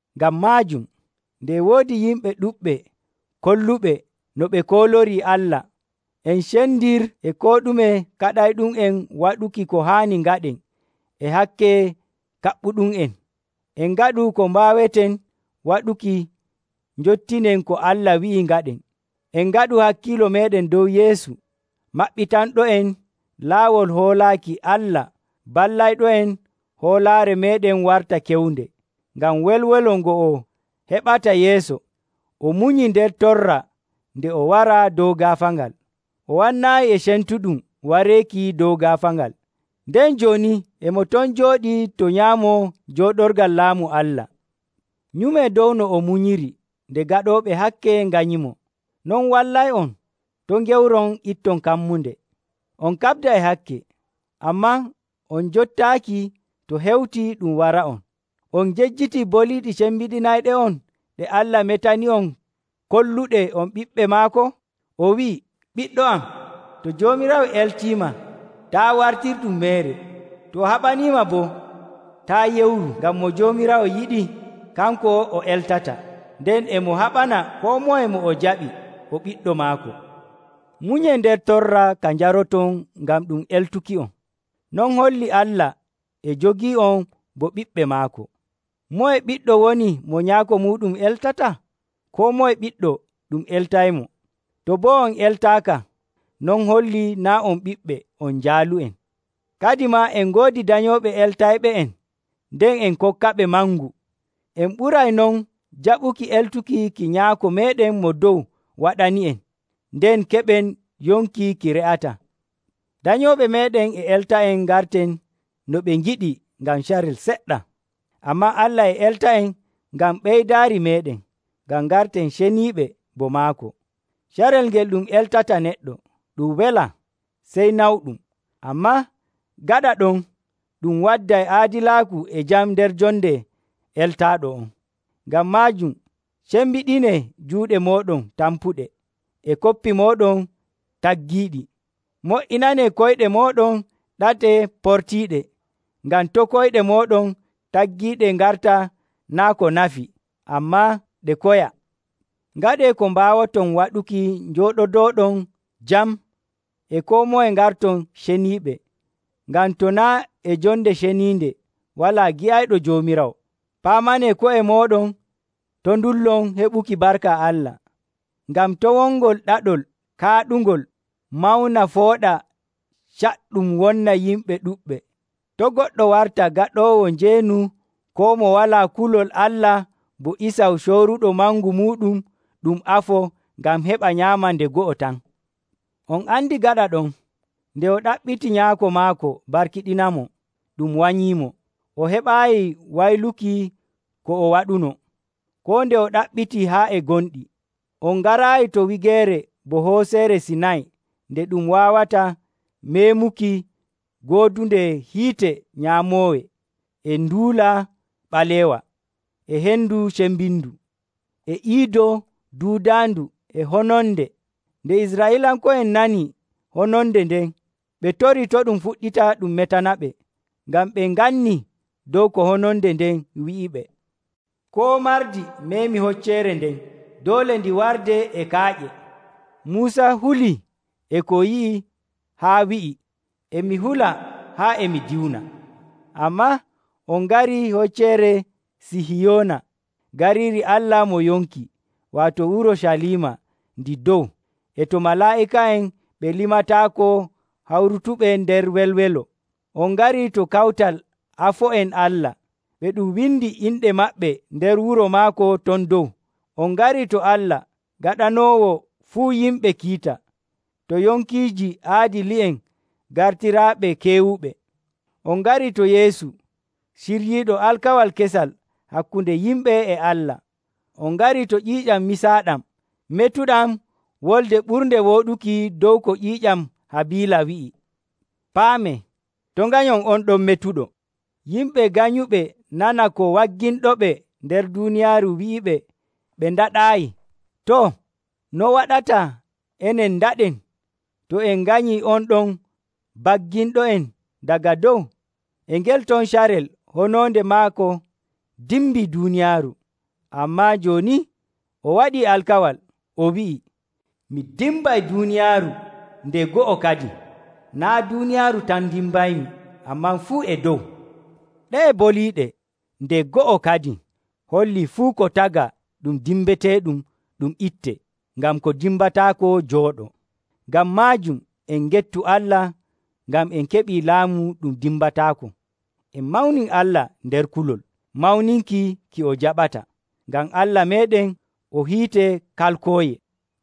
Ngam maajum, nde e woodi yimɓe ɗuɗɓe kolluɓe no ɓe koolorii Allah, en cendir e koo ɗume kaɗayɗum'en waɗuki ko haani ngaɗen e hakke kaɓɓuɗum'en. En ngaɗu ko mbaaweten waɗuki njottinen ko Allah wi'i ngaɗen. En ngaɗu hakkiilo meeɗen dow Yeesu, maɓɓitanɗo'en laawol hoolaaki Allah ballayɗo'en hoolaare meeɗen warta kewnde. Ngam welwelo ngo o heɓata yeeso, o munyii nder torra nde o waraa dow gaafaangal, o wannaayi e cemtuɗum wareeki dow gaafaangal, nden jooni e mo ton jooɗii to nyaamo jooɗorgal laamu Allah. Nyumee dow no o munyiri nde gaɗooɓe hakke nganyimo. Non wallay'on to' ngewron itton kammunde. On kaɓda e hakke, ammaa on njottaaki to hewti ɗum wara'on. On ngejjitii boliiɗe cembiɗinayɗe'on ɗe Allah metani'on kolluɗe on ɓiɓɓe maako? O wi'ii, “Ɓiɗɗo am, to Joomiraawo eltiima, taa' wartirɗum meere. To o haɓaniima boo, taa' yewru. Ngam mo Joomiraawo yiɗi, kanko o eltata, nden e mo haɓana koo moye mo o jaɓi o ɓiɗɗo maako.” Munyee nder torra ka njaroton ngam ɗum eltuki'on. Non hollii Allah e jogii'on bo ɓiɓɓe maako. Moye ɓiɗɗo woni mo nyaako muuɗum eltataa? Koo moye ɓiɗɗo ɗum eltaymo. To boo on eltaaka, non hollii naa' on ɓiɓɓe, on jaalu'en. Kadimaa en ngoodi danyooɓe eltayɓe'en nden en kokkaɓe mangu. En ɓuray non jaɓuki eltuki ki Nyaako meeɗen Mo Dow waɗani'en, nden keɓen yonki ki re'ataa! Danyooɓe meeɗen e elta'en ngarten no ɓe ngiɗi ngam carel seɗɗa. Ammaa Allah e elta'en ngam ɓeydaari meeɗen, ngam ngarten ceniiɓe bo maako. Carel ngel ɗum eltata neɗɗo, ɗum welaa, sey nawɗum. Ammaa gaɗa ɗon, ɗum wadday aadilaaku e jam nder jonde eltaaɗo'on. Ngam maajum cembiɗinee juuɗe mooɗon tampuɗe, e koppi mooɗon taggiiɗi. Mo''inanee koyɗe mooɗon ɗate portiiɗe, ngam to' koyɗe mooɗon taggiiɗe ngarta naa' ko nafi, ammaa ɗe koya. Ngaɗee ko mbaawoton waɗuki njooɗodooɗon jam e koo moye ngarton ceniiɓe, ngam to naa' e jonde ceniinde walaa gi'ayɗo Joomiraawo. Paamanee ko'e mooɗon to' ndullon heɓuki barka Allah, ngam to' wongol ɗaɗol kaaɗungol mawna fooɗa caɗɗum wonna yimɓe ɗuɗɓe. To' goɗɗo warta gaɗoowo njeenu koo mo walaa kulol Allah bo Isaw cooruɗo mangu muuɗum ɗum afo ngam heɓa nyaama nde go'o tan. On andi gaɗa ɗon, nde o ɗaɓɓiti nyaako maako barkiɗinamo, ɗum wanyiimo. O heɓaayi wayluki ko o waɗunoo, koo nde o ɗaɓɓitii haa e gonɗi. On ngaraayi to wigeere bo Hocceere Sinay nde ɗum waawata meemuki goodunde hiite nyaamooye, e nduula ɓalewa, e hendu cembindu, e iido duudaandu, e hononde. Nde Israa'iilanko'en nani hononde nden, ɓe torii to' ɗum fuɗɗita ɗum metanaɓe, ngam ɓe ngannii dow ko hononde nden wi'iɓe, “Koo mardi meemi hocceere nden, doole ndi wardee e kaaƴe.” Muusa hulii e ko yi'i haa wi'i, “E mi hula haa e mi diwna.” Ammaa on ngarii Hocceere Sihiyoona, gariiri Allah mo yonki, waato Urucaliima ndi dow, e to malaa'ika'en ɓe limataako hawrutuɓe nder welwelo. On ngarii to kawtal afo'en Allah, ɓe ɗum windi inɗe maɓɓe nder wuro maako ton dow. On ngarii to Allah, gaɗanoowo fuu yimɓe kiita, to yonkiiji aadili'en gartiraaɓe keewuɓe. On ngarii to Yeesu, ciryiiɗo alkawal kesal hakkunde yimɓe e Allah. On ngarii to ƴiiƴam misaaɗam metuɗam wolde ɓurnde wooɗuki dow ko ƴiiƴam Habiila wi'i. Paamee, to' nganyon on ɗon metuɗo. Yimɓe ganyuɓe nana ko wagginɗoɓe nder duuniyaaru wi'iɓe ɓe ndaɗaayi. Too, no waɗata enen ndaɗen, to en nganyii on ɗon bagginɗo'en daga dow? E ngel ton carel hononde maako dimbii duuniyaaru, ammaa jooni o waɗii alkawal, o wi'ii, “Mi dimbay duuniyaaru nde go'o kadin. Naa' duuniyaaru tan ndimbaymi, ammaa fuu e dow.” Ɗe'e boliiɗe, “nde go'o kadin” hollii fuu ko tagaa ɗum dimbeteeɗum ɗum ittee, ngam ko dimbataako jooɗoo. Ngam maajum en ngettu Allah ngam en keɓii laamu ɗum dimbataako. En mawnin Allah nder kulol, mawninki ki o jaɓata. Ngam Allah meeɗen o hiite kalkooye.